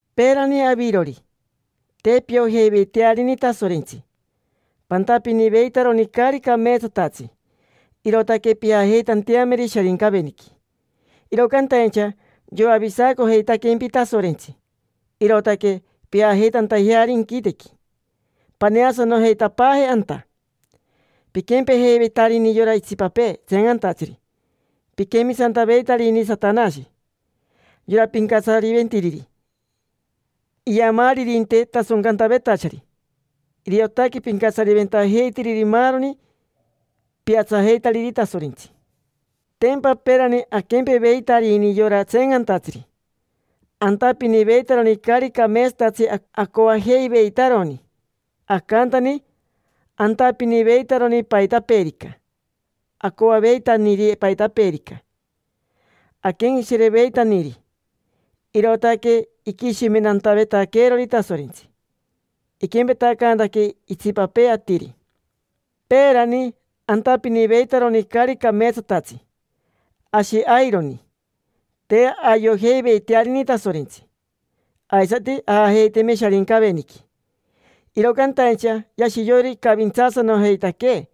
Peerani, avirori, te piojeiveitearini Tasorentsi, pantapiniveitaroni caari cameetsatatsi, irootaque pijajeitanteameri Sharincaveniqui: iro cantaincha yoavisacojeitaquempi Tasorentsi, irootaque pijajeitantajeari inquitequi, paneasanojeitapaaje anta. Piquempejeiveitarini yora itsipapee tseencantatsiri, piquemisantaveitarini Satanashi, yora pincatsariventiriri iamaaririnte tasoncantavetachari. Iriotaque pincatsariventajeitiriri maaroni piatsajeitariri Tasorentsi. Tempa peerani aquempeveitarini yora tseencantatsiri, antapiniveitaroni caari cameetsatatsi acoajeiveitaroni. Acantani, antapiniveitaroni paitapeerica acoaveitaniri, paitapeerica aquenqueshireveitaniri. Irootaque iquishimentantavetaqueerori Tasorentsi, iquempetacaantaquee itsipapee atiri. Peerani, antapiniveitaroni caari cameetsatatsi, ashi aironi: te ayojeiveitearini Tasorentsi, aisati ajajeiteme Sharincaveniqui. Iro cantaincha yashi yoiro icavintsaasanojeitaquee,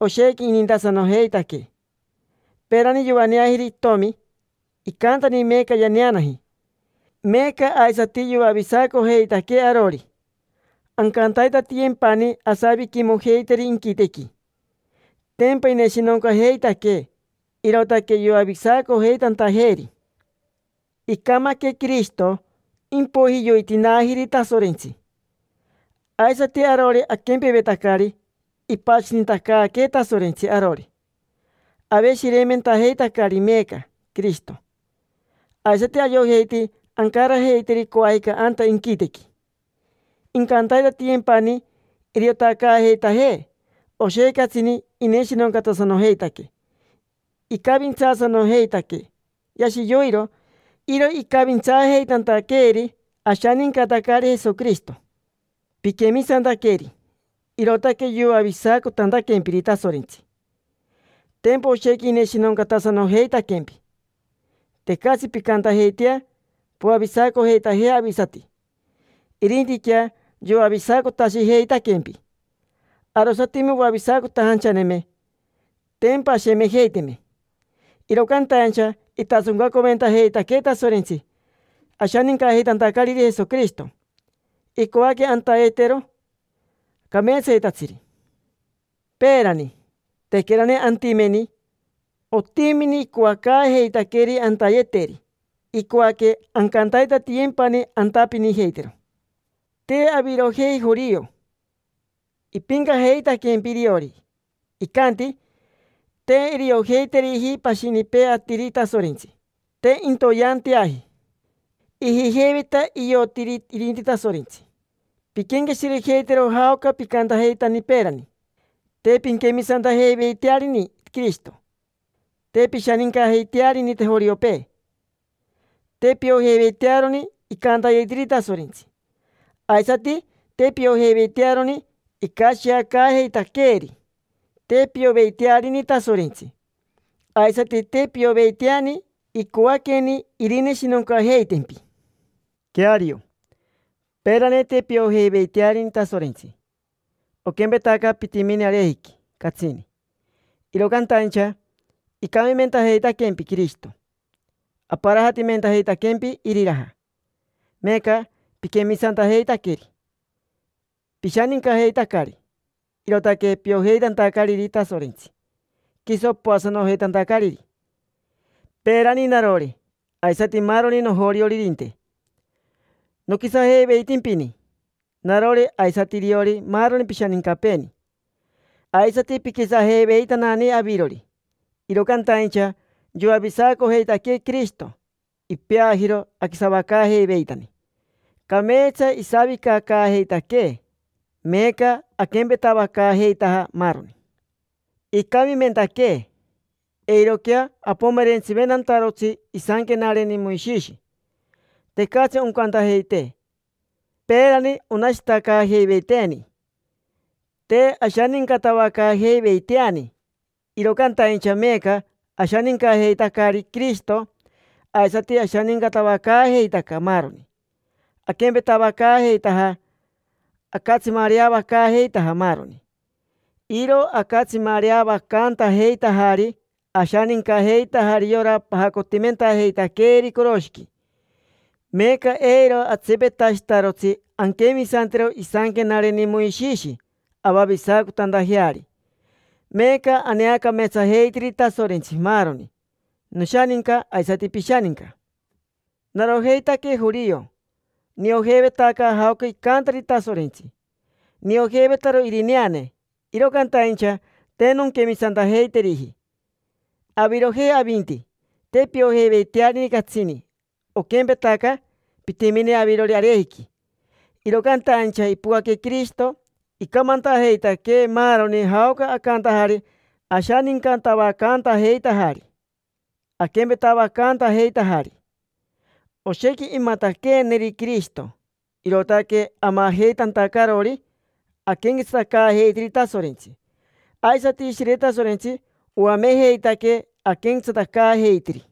oshequi inintasanojeitaquee. Peerani yoaneajiri itomi, icantani meeca yaneanaji. Meeca aisati yoavisacojeitaquee arori, ancantaitatiyempani asaviquimojeiteri inquitequi. Tempa ineshinoncajeitaquee, irootaque yoavisacojeitantajeeri. Icamaque Quirishito, impoiji yoitinaajiri Tasorentsi. Aisati arori aquempevetacari, ipashinitacaaquee Tasorentsi arori, aveshireimentajeitacari meeca Quirishito; aisati ayojeiti ancarajeiteri coajica anta inquitequi. Incantaitatiyempani iriotacaajeitajee, oshequi catsini ineshinoncatasanojeitaquee, icavintsaasanojeitaquee: yashi yoiro. Iro icavintsaajeitantaqueeri ashanincatacari Jesoquirishito. Piquemisantaqueri, irootaque yoavisacotantaquempiri Tasorentsi: tempa oshequi ineshinoncatasanojeitaquempi. Tecatsi pincantajeitea poavisacojeitajea avisati, irintiquea yoavisacotashijeitaquempi. Arosatime oavisacotajanchaneme, tempa ashemejeiteme. Iro cantaincha itasoncaventajeitaquee Tasorentsi ashanincajeitantacariri Jesoquirishito, icoaque antayetero cameetsayetatsiri. Peerani, tequerani antimeni, otimini icoacaajeitaqueeri antayeteri. Icoaque ancantaitatiyempani antapinijeitero. Te avirojei jorio. Ipincajeitaquempi iriori, icanti: “Te iriojeiteriji pashinipee atiri Tasorentsi, te intoyeanteaji”. Ijijeiveta iotiri irinti Tasorentsi. Pinquenqueshirejeitero jaoca picantajeitani peerani: te pinquemisantajeiveitearini Quirishito, te pishanincajeiteariji joriopee, te piojeiveitearoni icantayetiri Tasorentsi, aisati te piojeiveitearoni icashiacaajeitaqueeri. Te pioveitearini Tasorentsi, aisati te pioveiteani icoaqueni irineshinoncajeitempi. Queario, peerani te piojeiveitearini Tasorentsi, oquempetaca pitimini arejiqui catsini. Iro cantaincha icamimentajeitaquempi Quirishito, aparajatimentajeitaquempi iriraja. Meeca piquemisantajeitaqueri, pishanincajeitacari. Irootaque piojeitantacariri Tasorentsi, quiso poasanojeitantacariri. Peerani narori, aisati maaroni nojorioririnte, noquisajeiveitimpini: narori aisati iriori maaroni pishanincapeeni, aisati piquisajeiveitanani avirori. Iro cantaincha yoavisacojeitaquee Quirishito, ipeajiro aquisavacaajeiveitani, cameetsa isavicacaajeitaquee. Meeca aquempetavacaajeitaja maaroni. Icamimentaquee, eiroquea apomerentsiventantarotsi isanquenareni Moishishi, tecatsi oncantajeitee. Peerani onashitacaajeiveiteeni, te ashanincatavacaajeiveiteani. Iro cantaincha meeca ashanincajeitacari Quirishito, aisati ashanincatavacaajeitaca maaroni, aquempetavacaajeitaja, acatsimareavacaajeitaja maaroni. Iro acatsimareavacantajeitajari, ashanincajeitajari yora pajacotimentajeitaqueeri coroshiqui. Meeca eiro atsipetashitarotsi anquemisantero isanquenareni Moishishi avavisacotantajeari. Meeca aneacameetsajeitiri Tasorentsi maaroni: noshaninca aisati pishaninca. Narojeitaque jorio: niojeivetaca jaoca icantari Tasorentsi, niojeivetaro irineane, iro cantaincha te nonquemisantajeiteriji. Avirojei, avinti, te piojeiveitearini catsini, oquempetaca pitimini avirori arejiqui. Iro cantaincha ipocaque Quirishito, icamantajeitaquee maaroni jaoca acantajari ashanincatavacantajeitajari, aquempetavacantajeitajari. Oshequi imataqueeneri Quirishito, irootaque amajeitantacarori aquenquetsatacaajeitiri Tasorentsi. Aisati Ishire Tasorentsi oamejeitaquee aquenquetsatacaajeitiri.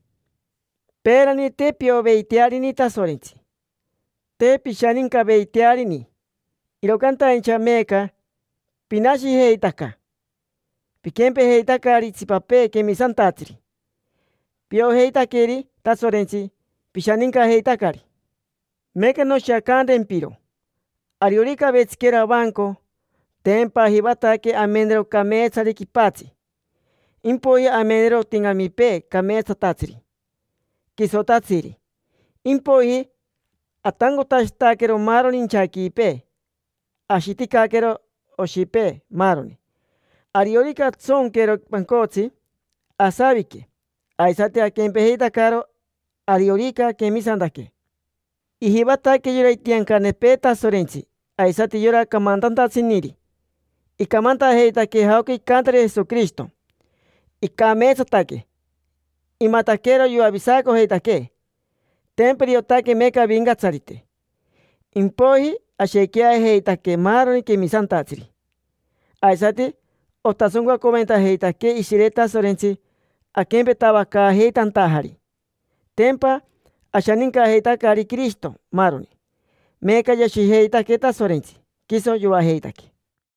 Peerani te pioveitearini Tasorentsi, te pishanincaveitearini. Iro cantaincha meeca, pinashijeitaca; piquempejeitacari itsipapee quemisantatsiri, piojeitaqueri Tasorentsi, pishanincajeitacari. Meeca noshiacantempiro. Ariorica avetsiquero avanco, tempa ajivataque amenero cameetsari quipatsi, impoiji amenero otincamipee cameetsatatsiri, quisotatsiri. Impoiji atancotashitaquero maaroni inchaquipee, ashiticaquero oshipee, maaroni. Ariorica antsonquero pancotsi, asavicaque. Aisati aquempejeitacaro, ariorica aquemisantaque. Ijivataque yora itiancanepee Tasorentsi aisati yora camantantatsiniri icamantajeitaquee jaoca icantari Jesoquirishito: icameetsataque, imataquero yoavisacojeitaquee. Tempa iriotaque meeca Avincatsarite. Impoiji ashequiajeitaque maaroni quemisantatsiri, aisati otasoncaventajeitaquee Ishire Tasorentsi aquempetavacaajeitantajari: tempa ashanincajeitacari Quirishito, maaroni. Meeca yashijeitaquee Tasorentsi, quiso yoajeitaquee.